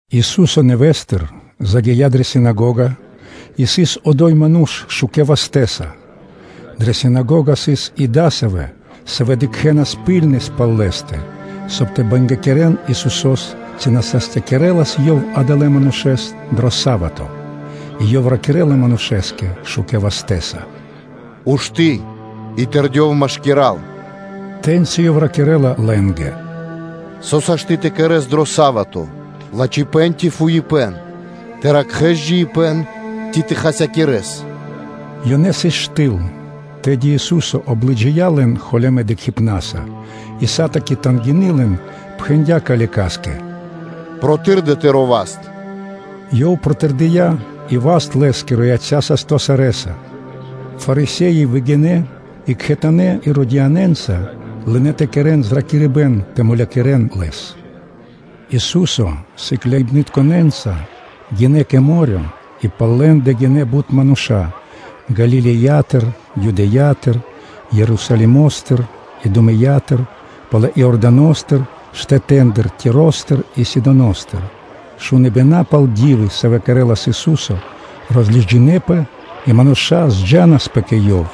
Ису́со нэвэ́стыр загия́ дрэ синагога, и сыс одо́й ману́ш шукэ́ вастэ́са. Дрэ синагога дыкхэнас ракхибны́ткэс пал Лэ́стэ, соб (кай) тэ бангякирэн Исусо́с, ци на састякирэлас Ёв адалэс манушэ́с дро са́вато. И Ёв ракирэ́ла манушэ́скэ шукэ́ вастэ́са: “Ушты́ и тэрдёв машкира́л.” Тэ́ньци Ёв ракирэ́ла лэ́нгэ: “Со сашты́ [пир Зако́но-ю.о.] тэ кэрэ́с дро са́вато: лачхипэ́н ци фуипэ́н, тэ ракхэ́с джиибэ́н ци тэ хасякирэс?” Ёнэ сыс штыл. Тэды Ису́со облыджия лэн холямэ́ дыкхибнаса, и тугиндя пал лэ́нгирэ пхарэ́ илэ, и пхэндя́ калекаскэ: “Протырдэ тыро́ васт!” Ёв протырдыя́, и васт лэ́скиро яця́ састо́ сарэ́са.” Фарисе́и выгинэ́, и кхэтанэ́ Иродианэнца лынэ́ тэ кэрэ́н зракирибэ́н тэ мулякирэ́н Лэс. Ису́со сыкляибнытконэ́нца гинэ́ кэ мо́рё (дэрья́в); и пал лэ́ндэ гинэ́ бут мануша́ Галилеятыр, Юдеятыр, Ерусалимо́стыр, Идумэятыр, палэ Иорданостыр, штэтэ́ндыр Тиростыр и Сидоностыр. Шуныбэна пал ди́вы, савэ́ кэрэ́лас Ису́со, розлыджинэпэ, и мануша́ зджанаспэ кэ Ёв.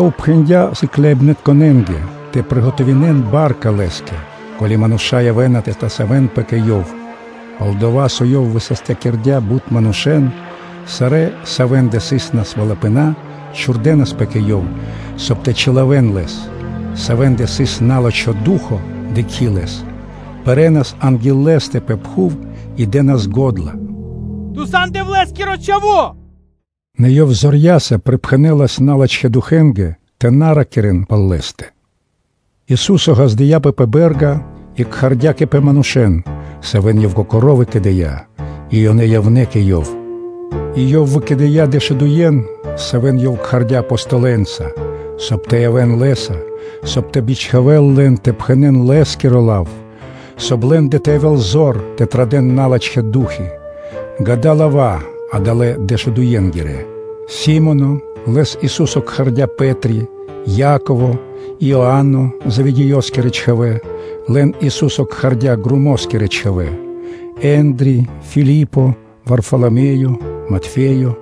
Ёв пхэндя́ сыкляибнытконэ́нгэ тэ скэдэ́н ба́рка (лодка) Лэ́скэ, ко́ли мануша́ явэ́на тэ тасавэнпэ кэ Ёв. Пал-дова́, со Ёв высастякирдя́ бут манушэ́н, сарэ́, савэ́ндэ сыс насвалыпэна (фра́нсы), чхурдэнаспэ кэ Ёв, соб (кай) тэ чилавэн Лэс. Савэ́ндэ сыс на́лачхо ду́хо (фа́но), дыкхи́ Лэс, пэрэнас анги́л Лэ́стэ пэ пхув и дэ́нас го́дла: “Ту сан Дэвлэ́скиро Чхаво́!” Нэ Ёв зорья́са припхэнэлас налачхэ́ духэнгэ тэ на ракирэ́н пал Лэ́стэ. Ису́со ґаздыя́пэ пэ бэ́рга и кхардя́ кэ пэ манушэ́н, савэ́н Ёв Кокоро́ выкэдыя́, и ёнэ явнэ́ кэ Ёв. И Ёв выкэдыя́ дэшудуен, савэ́н Ёв кхардя́ Апостолэнца, соб (кай) тэ явэ́н Лэ́са, соб (кай) тэ бичхавэл лэн тэ пхэнэ́н Лэ́скиро лав, соб (кай) лэ́ндэ тэ явэ́л зор тэ традэ́н налачхэ́ ду́хи: ґа́да, исын лава́ адалэ́ дэшудуенгирэ: Си́моно (лэс Ису́со кхардя́ “Пэ́три”), Яково и Иоано, Зеведеёскирэ чхавэ́, лэн Ису́со кхардя́ ґромоскирэ чхавэ́. Ендри (Андреё), Филипо, Варфаламеё, Матфеё,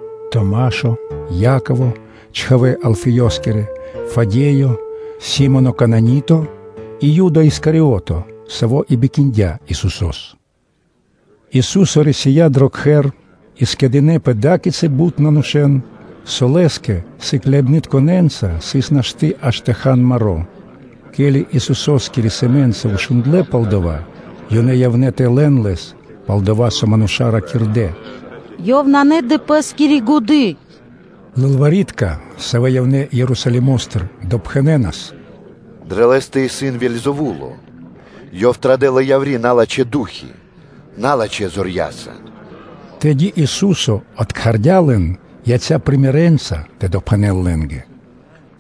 Яково (чхавэ́ Алфеёскирэ) Фадеё, Си́моно Кананито и Юда Искариото, саво́ и бикиндя Исусо́с. Ису́со рисия́ дро кхэр; и скэдынэ́пэ адакицык бут мануша́, со Лэ́скэ сыкляибнытконэ́нца сыс нашты́ аж тэ хан маро́. Ке́ли Исусо́скири сэмэ́нца шундлэ́ пал дава́, ёнэ явнэ́ тэ лэн Лэс, пал-дова́ со мануша́ ракирдэ́: “Ёв исын на дрэ Пэ́скири годы́.” Лылвари́тка (кни́жники), савэ́ явнэ́ Ерусалимо́стыр, допхэнэнас: “Дрэ Лэ́стэ исын Вельзэвуло. Ёв традэ́ла яври́ налачхэ́ ду́хи налачхэ́ зорья́са.” Тэды Ису́со откхардя лэн, яця́ примерэнца (сыкаибнэнца) тэ допхэнэл лэ́нгэ: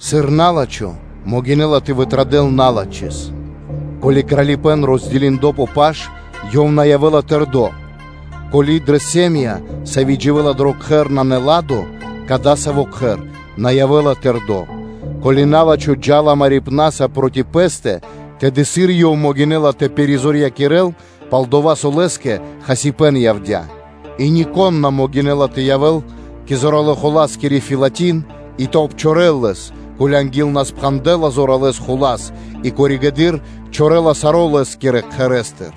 “Сыр на́лачхо могинэ́ла тэ вытрадэл налачхэ́с? Ко́ли кралипэ́н роскэрдо (уладо) пэ паш, ёв на явэ́ла тэрдо́. Ко́ли дрэ сэ́м΄я (ири́), сави́ дживэ́ла дро кхэр, нанэ ладо (миро), дасаво кхэр на явэ́ла тэрдо́. Ко́ли на́лачхо джа́ла марибна́са проти пэ́стэ, тэды сыр ёв могинэ́ла тэ пиризорьякирэл, пал-дова́ со лэ́скэ хасибэ́н явдя́. И нико́н на могинэ́ла тэ явэ́л кэ зоралэ́-хуласкиро кхэр фэлатин и тэ обчорэл лэс, ко́ли анги́л на пхандэла зоралэ́ хула́с, и коригэды́р (позжэды́р) чорэла саро́ лэ́скирэ кхэрэ́стыр.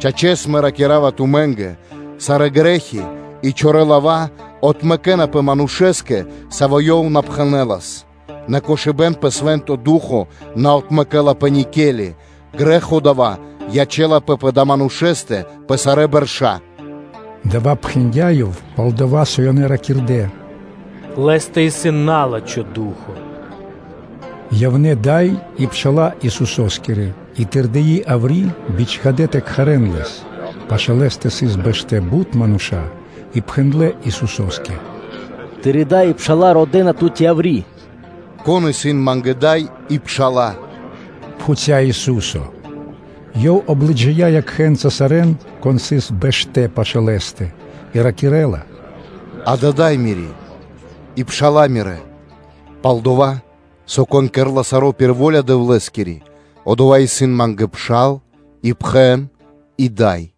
Чачэс, Мэ ракира́ва тумэ́нгэ: ‘Сарэ́ грэ́хи и чорэ́ лава́ отмэкэнапэ манушэ́скэ, савэ́ ёв на’ пхэнэлас; нэ кошыбэ́н пэ Свэ́нто Ду́хо (Фа́но) на отмэкэлапэ никели, грэ́хо дава́ ячэ́лапэ пэ далэ́ манушэ́стэ пэ сарэ́ бэрша́.’” Дава́ пхэндя́ Ёв, пал-дова́ со ёнэ ракирдэ́: “Лэ́стэ исын на́лачхо ду́хо (фа́но).” Явнэ́ дай и пша́ла Исусо́скирэ и, тэрдии яври́, бичхадэ́ тэ кхарэ́н Лэс. Пашы́л Лэ́стэ сыс бэштэ́ бут мануша́ и пхэндлэ́ Исусо́скэ: “Тыри́ дай и пша́ла родэ́на тут яври́.” “Кон исын Ма́нгэ дай и пша́ла?” пхуця́, – Ису́со Ёв облыджия якхэ́нца сарэ́н, кон сыс бэштэ́ пашы́л Лэ́стэ и ракирэ́ла: “Дава́ исын дай Мири́ и пша́ла Мирэ́; Пал-дова́ со, кон кэрэ́ла саро́ пир во́ля Дэвлэ́скири, одова́ исын Ма́нгэ пшал, и пхэн и дай.”